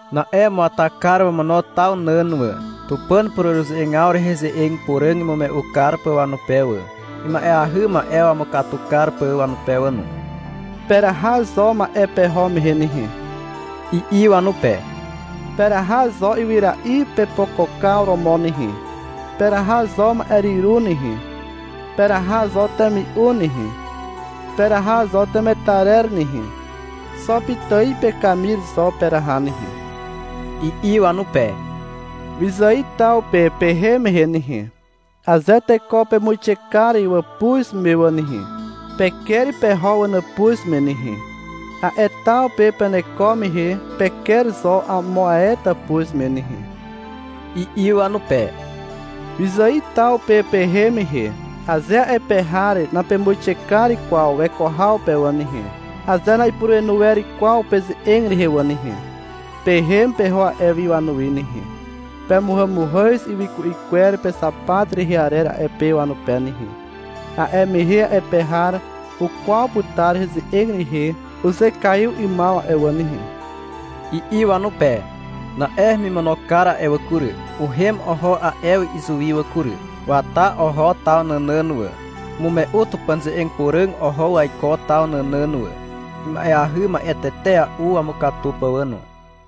Na'e umuata kar wamono taw nàn wà, Tupàn pureruze'egaw rehe ze'eg puràg imume'u kar pà wanupe wà, ima'eahy ma'e wamukatu kar pà wanupe wà no. — Peraha zo ma'e peho mehe nehe, i'i wanupe. — Peraha zo ywyra'i pepokokaw romo nehe. Peraha zo ma'e hyru nehe. Peraha zo temi'u nehe. Peraha zo temetarer nehe. Xo pitài pekamir zo peraha nehe, i'i wanupe. — Wyzài taw pe pehem mehe nehe, aze teko pemuixe kar wàpuz me wà nehe, peker peho wanàpuz me nehe. A'e taw pe peneko mehe peker zo amo ae tàpuz me nehe, i'i wanupe. — Wyzài taw pe pehem mehe, aze a'e pe har napemuixe kar kwaw weko haw pe wà nehe, aze na'ipurenu wer kwaw peze'eg rehe wà nehe, pehem peho a'e wi wanuwi nehe. Pemuhàmuhàz ywyku'i kwer pexapat rehe arer a'e pe wanupe nehe. A'e mehe a'e pe har ukwaw putar heze'eg rehe uzekaiw 'ymaw a'e wà nehe, i'i wanupe. Na'e hemimono kar a'e wà kury, uhem oho a'e wi izuwi wà kury. Wata oho taw nànàn wà. Umume'u Tupàn ze'eg puràg oho waiko taw nànàn wà, ima'eahy ma'e tetea'u wamukatu pà wà no.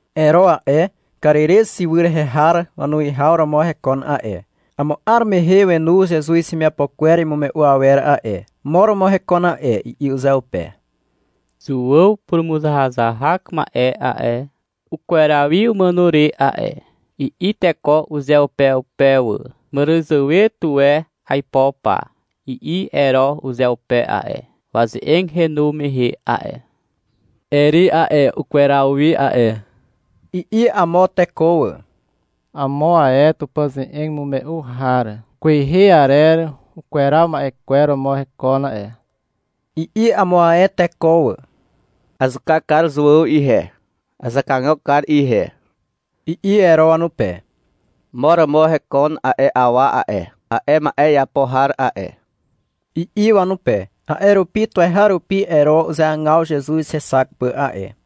Ero a'e, Karirez ywy rehe har wanuwihaw romo hekon a'e. Amo 'ar mehe wenu Zezuz hemiapo kwer imume'u awer a'e. — Mo romo hekon a'e, i'i uzeupe. — Zuàw purumuzahazahak ma'e a'e, ukweraw wi umàno re a'e, i'i teko uzeupeupe wà. — Màràzàwe tuwe aipo pa, i'i Ero uzeupe a'e, waze'eg henu mehe a'e. — Eri a'e, ukweraw wi a'e, i'i amo teko wà. — Amo ae Tupàn ze'eg imume'u har kwehe arer ukweraw ma'e kwer romo hekon a'e, i'i amo ae teko wà. — Azuka kar Zuàw ihe. Azakagok kar ihe, i'i Ero wanupe. — Mo romo hekon a'e awa a'e, a'e ma'e iapo har a'e, i'i wanupe. A'e rupi tuweharupi Ero uzeagaw Zezuz hexak pà a'e.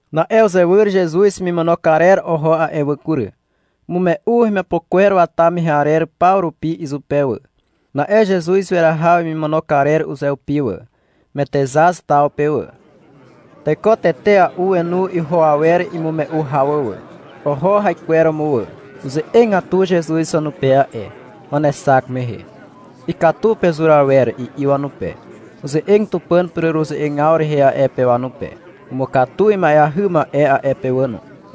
Na'e uzewyr Zezuz hemimono karer oho a'e wà kury. Umume'u wemiapo kwer wata mehe arer paw rupi izupe wà. Na'e Zezuz weraha wemimono karer uzeupi wà, Metexaz taw pe wà. Teko tetea'u wenu iho awer imume'u haw wà. Oho haikweromo wà. Uze'egatu Zezuz wanupe a'e, wanexak mehe. — Ikatu pezur awer, i'i wanupe. Uze'eg Tupàn pureruze'egaw rehe a'e pe wanupe. Umukatu ima'eahy ma'e a'e pe wà no.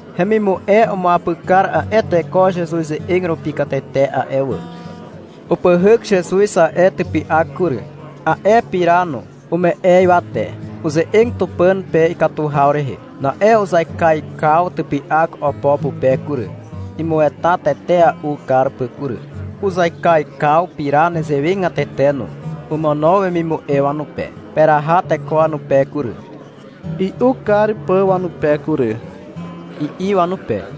Hemimu'e umuapyk kar a'e teko Zezuz ze'eg rupi katete a'e wà. Upyhyk Zezuz a'e typy'ak kury, a'e pira no. Ume'e ywate. Uze'eg Tupàn pe ikatu haw rehe. Na'e uzaikaikaw typy'ak opo pupe kury, (imueta tetea'u kar pà kury). Uzaikaikaw pira nezewegatete no. Omono wemimu'e wanupe. — Peraha teko wanupe kury, i'u kar pà wanupe kury, i'i wanupe.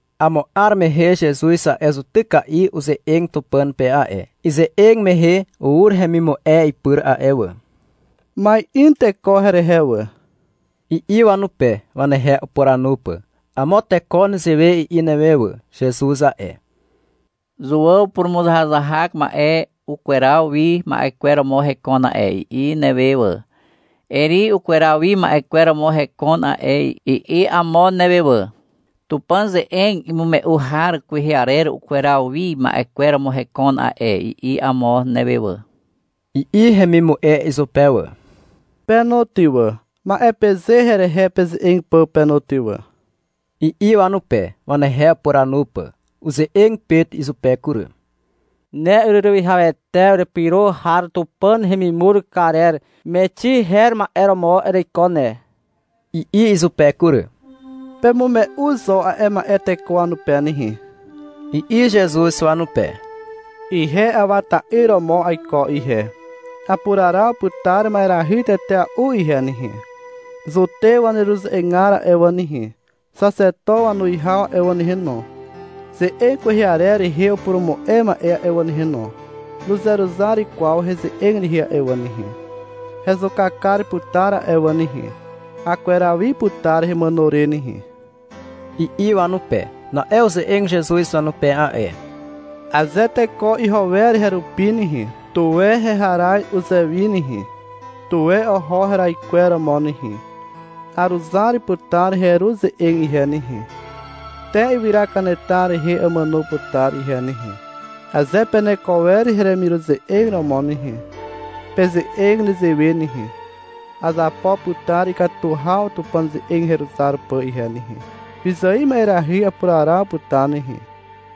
Amo 'ar mehe Zezuz a'e zutyka'i uze'eg Tupàn pe a'e. Ize'eg mehe ur hemimu'e ipyr a'e wà. — Ma'in teko herehe wà, i'i wanupe, wanehe upuranu pà. — Amo teko nezewe i'i newe wà, — Zezuz a'e, Zuàw purumuzahazahak ma'e ukweraw wi ma'e kwer romo hekon a'e, i'i newe wà. — Eri ukweraw wi ma'e kwer romo hekon a'e, i'i amo newe wà. — Tupàn ze'eg imume'u har kwehe arer ukweraw wi ma'e kwer romo hekon a'e, i'i amo newe wà, i'i hemimu'e izupe wà. — Pe no ty wà, ma'e peze herehe peze'eg pà pe no ty wà, i'i wanupe, wanehe upuranu pà. Uze'eg Pet izupe kury. — Ne ureruwihawete urepyro har Tupàn hemimur karer Mexi her ma'e romo ereiko ne, i'i izupe kury. — Pemume'u zo a'e ma'e teko wanupe nehe, i'i Zezuz wanupe. — Ihe Awa ta'yr romo aiko ihe, apuraraw putar ma'erahy tetea'u ihe nehe. Zutew waneruze'egar a'e wà nehe, xaxeto wanuwihaw a'e wà nehe no, ze'eg kwehe arer rehe upurumu'e ma'e a'e wà nehe no, nuzeruzar kwaw heze'eg rehe a'e wà nehe. Hezuka kar putar a'e wà nehe. Akweraw wi putar hemàno re nehe, i'i wanupe. Na'e uze'eg Zezuz wanupe a'e. — Aze teko iho wer herupi nehe, tuwe heharaz uzewi nehe, tuwe oho heraikweromo nehe. Aruzar putar heru ze'eg ihe nehe, te ywyra kanetar rehe amàno putar ihe nehe. Aze peneko wer heremiruze'eg romo nehe, peze'eg nezewe nehe. — Azapo putar ikatu haw Tupàn ze'eg heruzar pà ihe nehe. Wyzài ma'erahy apuraraw putar nehe,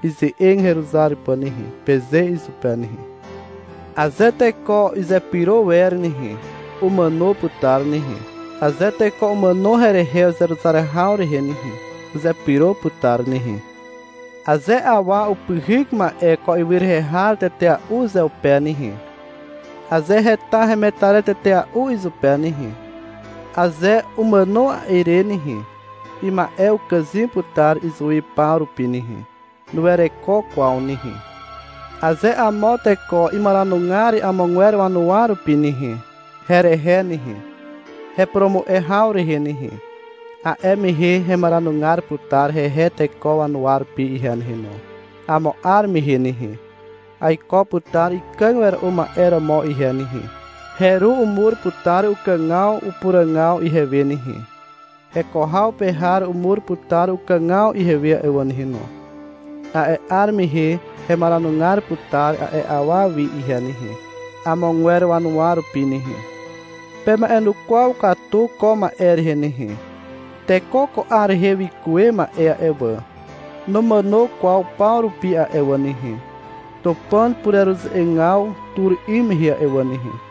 ize'eg heruzar pà nehe, peze izupe nehe. Aze teko izepyro wer nehe, umàno putar nehe. Aze teko umàno herehe uzeruzar haw rehe nehe, uzepyro putar nehe. Aze awa upyhyk ma'e ko ywy rehe har tetea'u uzeupe nehe, aze heta hemetarer tetea'u izupe nehe, aze umàno a'e re nehe, ima'e ukàzym putar izuwi paw rupi nehe. Nuwereko kwaw nehe. Aze amo teko imaranugar amogwer wanuwa rupi nehe, herehe nehe, hepurumu'e haw rehe nehe, a'e mehe hemaranugar putar hehe teko wanuwa rupi ihe nehe no. Amo 'ar mehe nehe, aiko putar ikàg wera'u ma'e romo ihe nehe. Heru umur putar ukàgaw upuràgaw ihewe nehe. Heko haw pe har umur putar ukàgaw ihewe a'e wà nehe no. A'e 'ar mehe hemaranugar putar a'e awa wi ihe nehe, amogwer wanuwa rupi nehe. Pema'enukwaw katu ko ma'e rehe nehe. Teko ko 'ar rehe wikuwe ma'e a'e wà, numàno kwaw paw rupi a'e wà nehe, Tupàn pureruze'egaw tur 'ym mehe a'e wà nehe.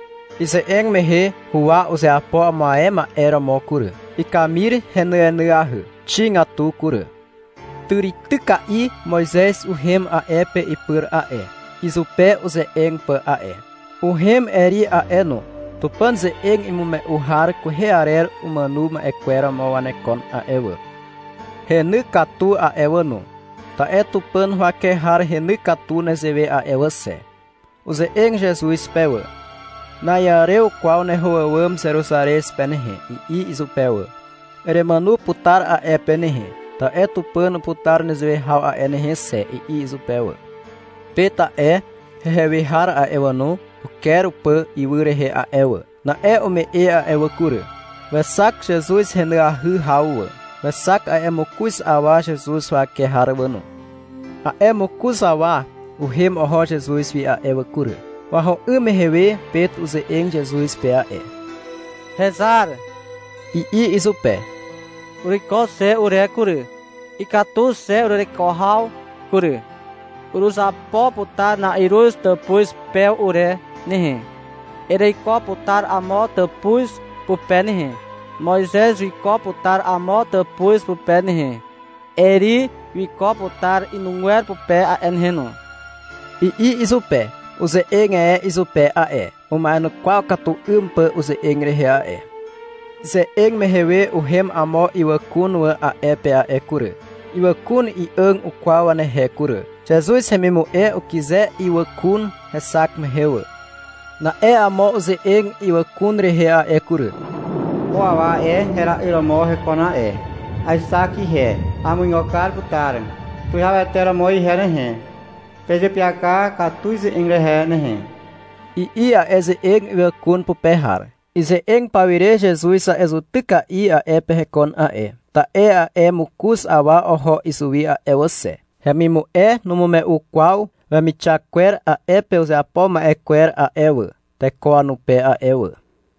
Ize'eg mehe huwa uzeapo amo ae ma'e romo kury. Ikamir henyenyahy, xigatu kury. Tàrityka'i Moizez uhem a'e pe ipyr a'e, izupe uze'eg pà a'e. Uhem Eri a'e no. (Tupàn ze'eg imume'u har kwehe arer umàno ma'e kwer romo wanekon a'e wà.) Heny katu a'e wà no, ta'e Tupàn huwake har heny katu nezewe a'e wà xe. Uze'eg Zezuz pe wà. — Na'iàrew kwaw neho àwàm Zeruzarez pe nehe, i'i izupe wà. — Eremàno putar a'e pe nehe, ta'e Tupàn uputar nezewe haw a'e nehe xe, i'i izupe wà. Pet a'e, hehe we har a'e wà no, uker upà ywy rehe a'e wà. Na'e ume'e a'e wà kury. Wexak Zezuz henyahy haw wà. Wexak a'e mokoz awa Zezuz huwake har wà no. A'e mokoz awa uhem oho Zezuz wi a'e wà kury. Waho 'ym mehe we Pet uze'eg Zezuz pe a'e. — Hezar, i'i izupe. — Uruiko xe ure kury. Ikatu xe urereko haw kury. Uruzapo putar na'iruz tàpuz pew ure nehe. Ereiko putar amo tàpuz pupe nehe. Moizez wiko putar amo tàpuz pupe nehe. Eri wiko putar inugwer pupe a'e nehe no, i'i izupe. (Uze'eg e izupe a'e, uma'enukwaw katu 'ym pà uze'eg rehe a'e.) Ize'eg mehe we uhem amo ywàkun wà a'e pe a'e kury. Ywàkun i'àg ukwaw wanehe kury. Zezuz hemimu'e ukyze ywàkun hexak mehe wà. Na'e amo uze'eg ywàkun rehe a'e kury. — Ko awa a'e, hera'yr romo hekon a'e. Aexak ihe, amuigo kar putar tuwihawete romo ihe nehe. Pezeapyaka katu ize'eg rehe nehe, i'i a'e ze'eg ywàkun pupe har. Ize'eg pawire Zezuz a'e zutyka'i a'e pe hekon a'e. Ta'e a'e mokoz awa oho izuwi a'e wà xe. Hemimu'e numume'u kwaw wemixak kwer a'e pe uzeapo ma'e kwer a'e wà, teko wanupe a'e wà.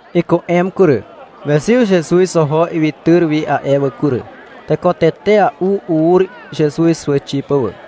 Iku'em kury. Wezyw Zezuz oho ywytyr wi a'e wà kury. Teko tetea'u ur Zezuz huwàxi pà wà.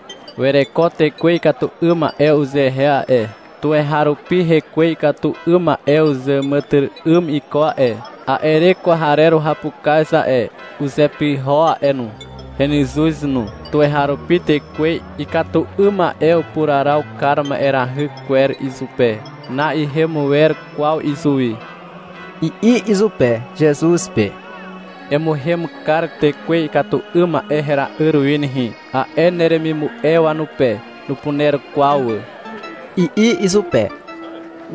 — Wereko tekwe ikatu 'ym ma'e uzehe a'e. Tuweharupi hekwe ikatu 'ym ma'e uzàmàtyry'ym iko a'e. A'e re kwarer uhapukaz a'e, uzepyho a'e no. Henyzuz no. Tuweharupi tekwe ikatu 'ym ma'e upuraraw kar ma'erahy kwer izupe. Na'ihem wer kwaw izuwi, i'i izupe, Zezuz pe. — Emuhem kar tekwe ikatu 'ym ma'e hera'yr wi nehe, a'e neremimu'e wanupe. Nupuner kwaw wà, i'i izupe.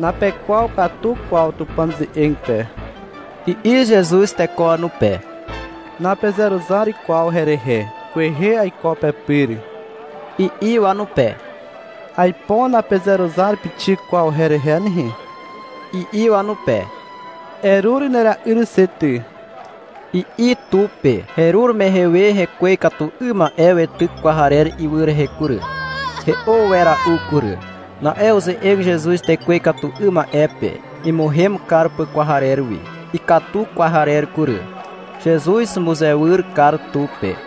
— Napekwaw katu kwaw Tupàn ze'eg pe, i'i Zezuz teko wanupe. — Napezeruzar kwaw herehe. Kwehe aiko pepyr, i'i wanupe. — Aipo napezeruzar pixik kwaw herehe nehe, i'i wanupe. — Erur nera'yr xe ty, i'i tu pe. Herur mehe we hekwe ikatu 'ym ma'e weityk kwarer ywy rehe kury. He'o wera'u kury. Na'e uze'eg Zezuz tekwe ikatu 'ym ma'e pe, imuhem kar pà kwarer wi. Ikatu kwarer kury. Zezuz umuzewyr kar tu pe.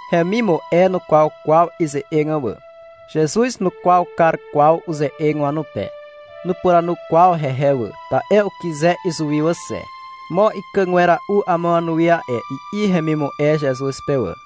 Hemimu'e nukwaw kwaw ize'eg wà. Zezuz nukwaw kar kwaw uze'eg wanupe. Nupuranu kwaw hehe wà, ta'e ukyze izuwi wà xe. — Mo ikàg wera'u amo wanuwi a'e, i'i hemimu'e Zezuz pe wà.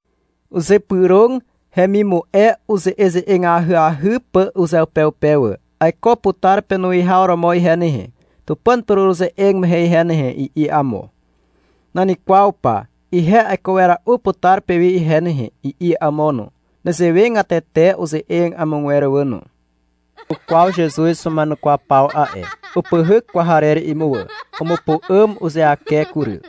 Uzypyrog hemimu'e uze'eze'eg ahyahy pà uzeupeupe wà. — Aiko putar penuwihaw romo ihe nehe, Tupàn pureruze'eg mehe ihe nehe, i'i amo. — Nan kwaw pa, ihe aiko wera'u putar pewi ihe nehe, i'i amo no. Nezewegatete uze'eg amogwer wà no. Ukwaw Zezuz wama'enukwaw paw a'e. Upyhyk kwarer imuwà. Umupu'àm uzeake kury.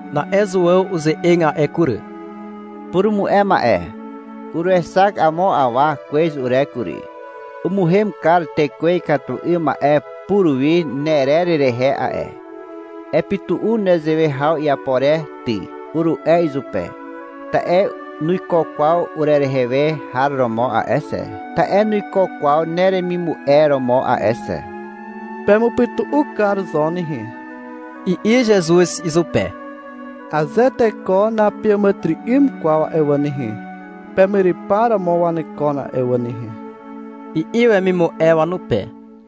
Na'e Zuàw uze'eg a'e kury. — Purumu'e ma'e. Uruexak amo awa kwez ure kury. Umuhem kar tekwe ikatu 'ym ma'e puruwi nerer rehe a'e. Epytu'u nezewe haw iapo re ty, uru'e izupe, ta'e nuiko kwaw urerehe we har romo a'e xe, ta'e nuiko kwaw neremimu'e romo a'e xe. — Pemupytu'u kar zo nehe, i'i Zezuz izupe. — Aze teko napeàmàtyry'ym kwaw a'e wà nehe, pemyrypar romo wanekon a'e wà nehe, i'i wemimu'e wanupe.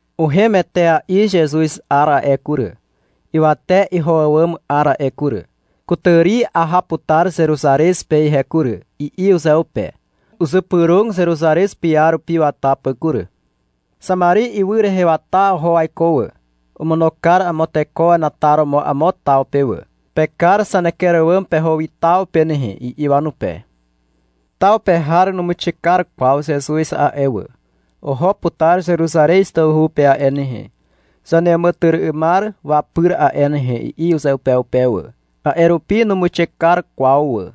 Uhem etea'i Zezuz 'ar a'e kury, ywate iho àwàm 'ar a'e kury. — Kutàri aha putar Zeruzarez pe ihe kury, i'i uzeupe. Uzypyrog Zeruzarez piarupi wata pà kury. Xamari ywy rehe wata oho waiko wà. Omono kar amo teko wenataromo amo taw pe wà. — Pekar zaneker àwàm peho wi taw pe nehe, i'i wanupe. Taw pe har numuixe kar kwaw Zezuz a'e wà. — Oho putar Zeruzarez tawhu pe a'e nehe, zaneàmàtyry'ymar wapyr a'e nehe, i'i uzeupeupe wà. A'e rupi numuixe kar kwaw wà.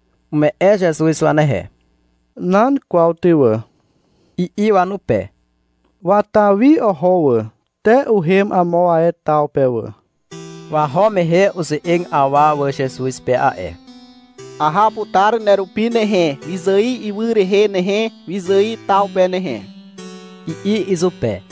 Ume'e Zezuz wanehe. — Nan kwaw ty wà, i'i wanupe. Wata wi oho wà, te uhem amo ae taw pe wà. Waho mehe uze'eg awa wà Zezuz pe a'e. — Aha putar nerupi nehe, wyzài ywy rehe nehe, wyzài taw pe nehe, i'i izupe.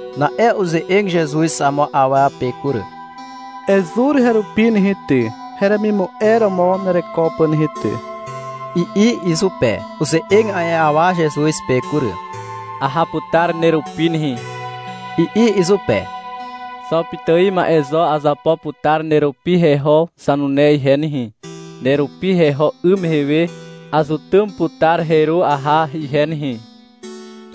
Na'e uze'eg Zezuz amo awa pe kury. — Ezur herupi nehe ty, heremimu'e romo nereko pà nehe ty, i'i izupe. Uze'eg a'e awa Zezuz pe kury. — Aha putar nerupi nehe, i'i izupe. — Xo pitài ma'e zo azapo putar nerupi heho zanune ihe nehe. Nerupi heho 'ym mehe we azutym putar heru aha ihe nehe,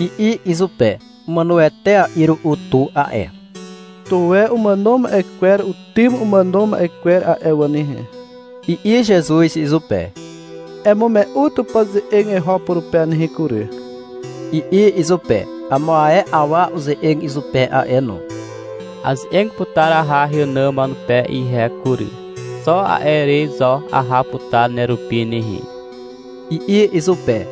i'i izupe. (Umàno etea'i ru'u tu a'e.) — Tuwe umàno ma'e kwer utym umàno ma'e kwer a'e wà nehe, i'i Zezuz izupe. Emume'u Tupàn ze'eg eho purupe nehe kury, i'i izupe. Amo ae awa uze'eg izupe a'e no. Aze'eg putar aha heànàm wanupe ihe kury. Xo a'e re zo aha putar nerupi nehe, i'i izupe.